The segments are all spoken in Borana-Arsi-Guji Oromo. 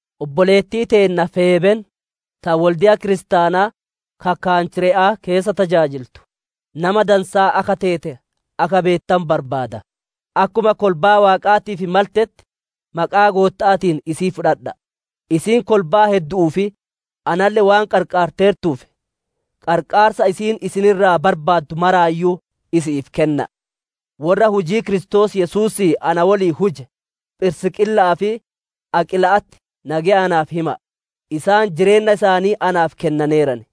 Obboleettii teenna Feebeen, ta wolde'a kiristaanaa ka Kanchire'aa keessa tajaajiltu, nama dansaa akka teete akka beettanu barbaada. Akkuma kolbaa Waaqaatiif maltetti, maqaa Gootta'aatiin isii fudhadha'a! Isiin kolbaa heddu'uu fi analle waan qarqaarteertuuf, qarqaarsa isiin isin irraa barbaaddu maraayyuu isi'iif kenna'a. Worra hujii Kiristoos Yesuusii na woliin huje, Phirisqiila'aa fi Aqiila'atti nageya naaf hima'a. Isaan jireenna isaanii naaf kennaneeran.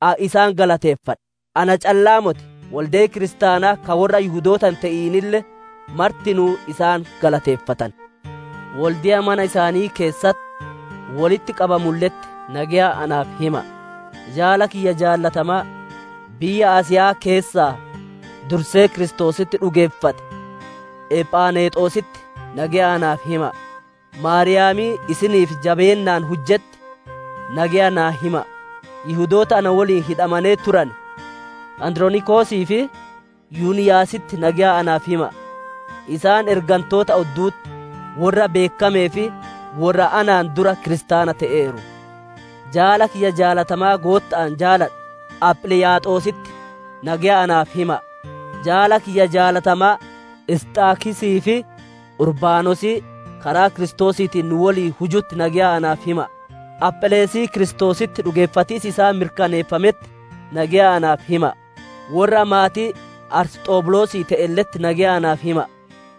Ani isaan galateeffadha; na calla'aa motii wolde'i kiristaanaa ka worra Yihudoota hin te'inille martinuu isaan galateeffatan. Wolde'a mana isaanii keessatti wolitti qabamulle'etti nageya naaf hima'a. Jaala kiyya jaalatamaa, biyya Asiya'aa keessaa dursee Kiristoositti dhugeeffate Ephanexositti nageya naaf hima'a. Maariyaamii isiniif jabeennaan hujjetti, nageya naa hima'a. Yihudoota na woliin hidhamanee turane Andironikosii fi Yuniyaasitti nageya naaf hima'a; isaan ergantoota oddu'utti worra beekkamee fi worra anaan dura kiristaana te'eeru. Jaala kiyya jaalatamaa Gootta'aan jaaladhu, Aphiliiyaaxositti nageya naaf hima'a. Jaala kiyya jaalatamaa Isxaakisii fi Urbaanosii karaa Kiristoosiitiin nu woliin hujutti nageya naaf hima'a. Aphelesii Kiristoositti dhugeeffatiis isaa mirkaneeffametti nageya naaf hima'a. Worra maatii Arisxobulosii te'elle'etti nageya naaf hima'a.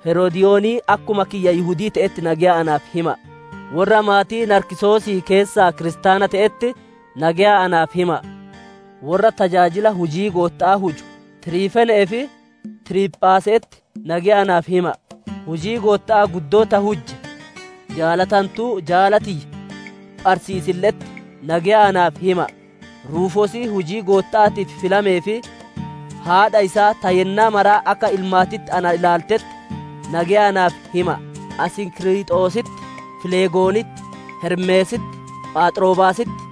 Herodiyoonii akkuma kiyya Yihudii te'etti nageya naaf hima'a. Worra maatii Naarkisosii keessaa kiristaana te'etti nageya naaf hima'a. Worra tajaajila hujii Gootta'aa huju, Tiriifeenee fi Tiriiphaase'etti nageya naaf hima'a. Hujii Gootta'aa guddoo ta hujje, jaalatantuu jaala tiyya Pharsiisille'etti nageya naaf hima'a. Ruufoosii hujii Gootta'aatii filamee fi haadha isaa, ta yennaa mara akka ilmaatitti ana ilaaltetti nageya naaf hima'a. Asinkiriixositti, Filegoonitti, Hermeesitti, Phaaxrobaasitti,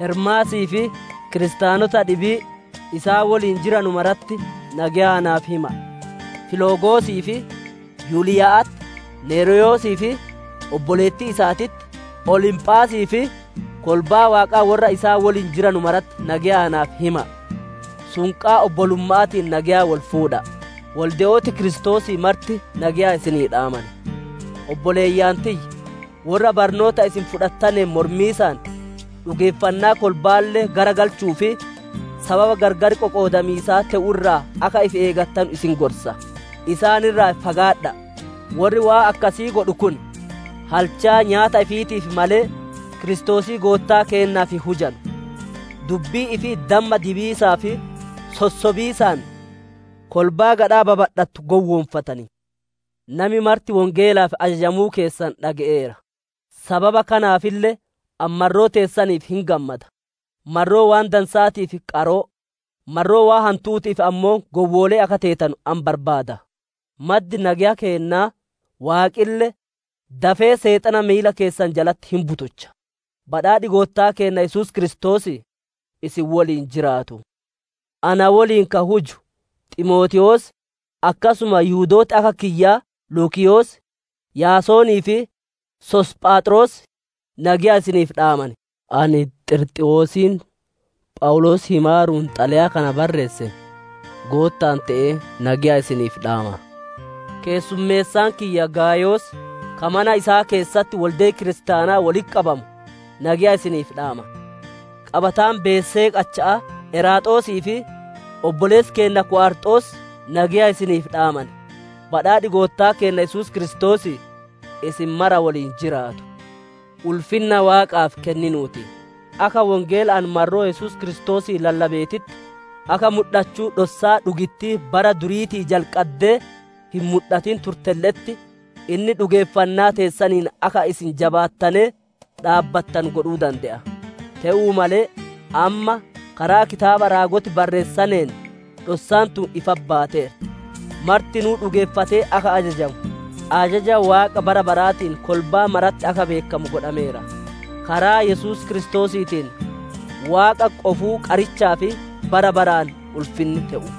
Hermaasii fi kiristaanota dhibii isaan woliin jiranu maratti nageya naaf hima'a. Filogosii fi Yuliya'atti, Neryoosii fi obboleettii isaatitti, Olimphaasii fi kolbaa Waaqaa worra isaan woliin jiranu maratti nageya naaf hima'a. Sunqaa obbolumma'aatiin nageya wol fuudha'a. Wolde'ooti Kiristoosii marti nageya isinii dhaaman. Obboleeyyan tiyya! Worra barnoota isin fudhattaneen mormiisaan, dhugeeffannaa kolba'aalle garagalchuu fi sababa gargar qoqoodamiisaa te'u irraa akka ifi eegattanu isin gorsa. Isaan irraa fagaadha'a! Worri waan akkasii godhu kun halchaa nyaata ifiitiif malee, Kiristoosii Goottaa keennaaf hin hujanu. Dubbii ifii damma dibiisaa fi sossobiisaan kolbaa gadhaa babadhattu gowwoonfatan. Nami marti Wongeelaaf ajajamuu keessan dhage'eera; sababa kanaafille ani marroo teessaniif hin gammada. Marroo waan dansa'aatiif qaroo, marroo waan hantu'uutiif ammoo gowwoolee akka teetanu ani barbaada. Maddi nageya keennaa, Waaqille, dafee Seexana miila keessan jalatti hin butucha. Badhaadhi Goottaa keenna Yesuus Kiristoosii isin woliin jiraatu. Ana woliin ka huju, Ximootewoos akkasuma Yihudooti akka kiyyaa Luukiyoos, Yaasonii fi Soosiiphaaxroos nageya isiniif dhaaman. Ani Xirxiwoosiin Phawuloos himaaruun xalayaa kana barreesse, Gootta'aan te'ee nageya isiniif dhaama. Keessummeessaan kiyya Gaayos, ka mana isaa keessatti wolde'i kiristaana wolitti qabamu, nageya isiniif dhaama. Qabataan beesee qacha'aa, Eraasxoos fi obboleessi keenna Ku'arxoos, nageya isiniif dhaaman. Badhaadhi Goottaa keenna Yesuus Kiristoosii isin mara woliin jiraatu. Ulfinna Waaqaaf kenninuu ti! Akka Wongeela ani marroo Yesuus Kiristoosii lallabeetitti, akka mudhachuu dhossaa dhugittii bara duriitii jalqaddee hin mudhatin turtelle'etti, inni dhugeeffanna teessaniin akka isin jabaattanee dhaabbattanu godhuu dande'a. Te'uu male, amma, karaa kitaaba raagoti barreessaneen dhossaan tun ifatti baateerti; martinuu dhugeeffatee akka ajajamu, ajaja Waaqa bara baraatiin kolbaa maratti akka beekkamu godhameera. Karaa Yesuus Kiristoosiitiin, Waaqa qofuu qarichaaf, bara baraan ulfinni te'u.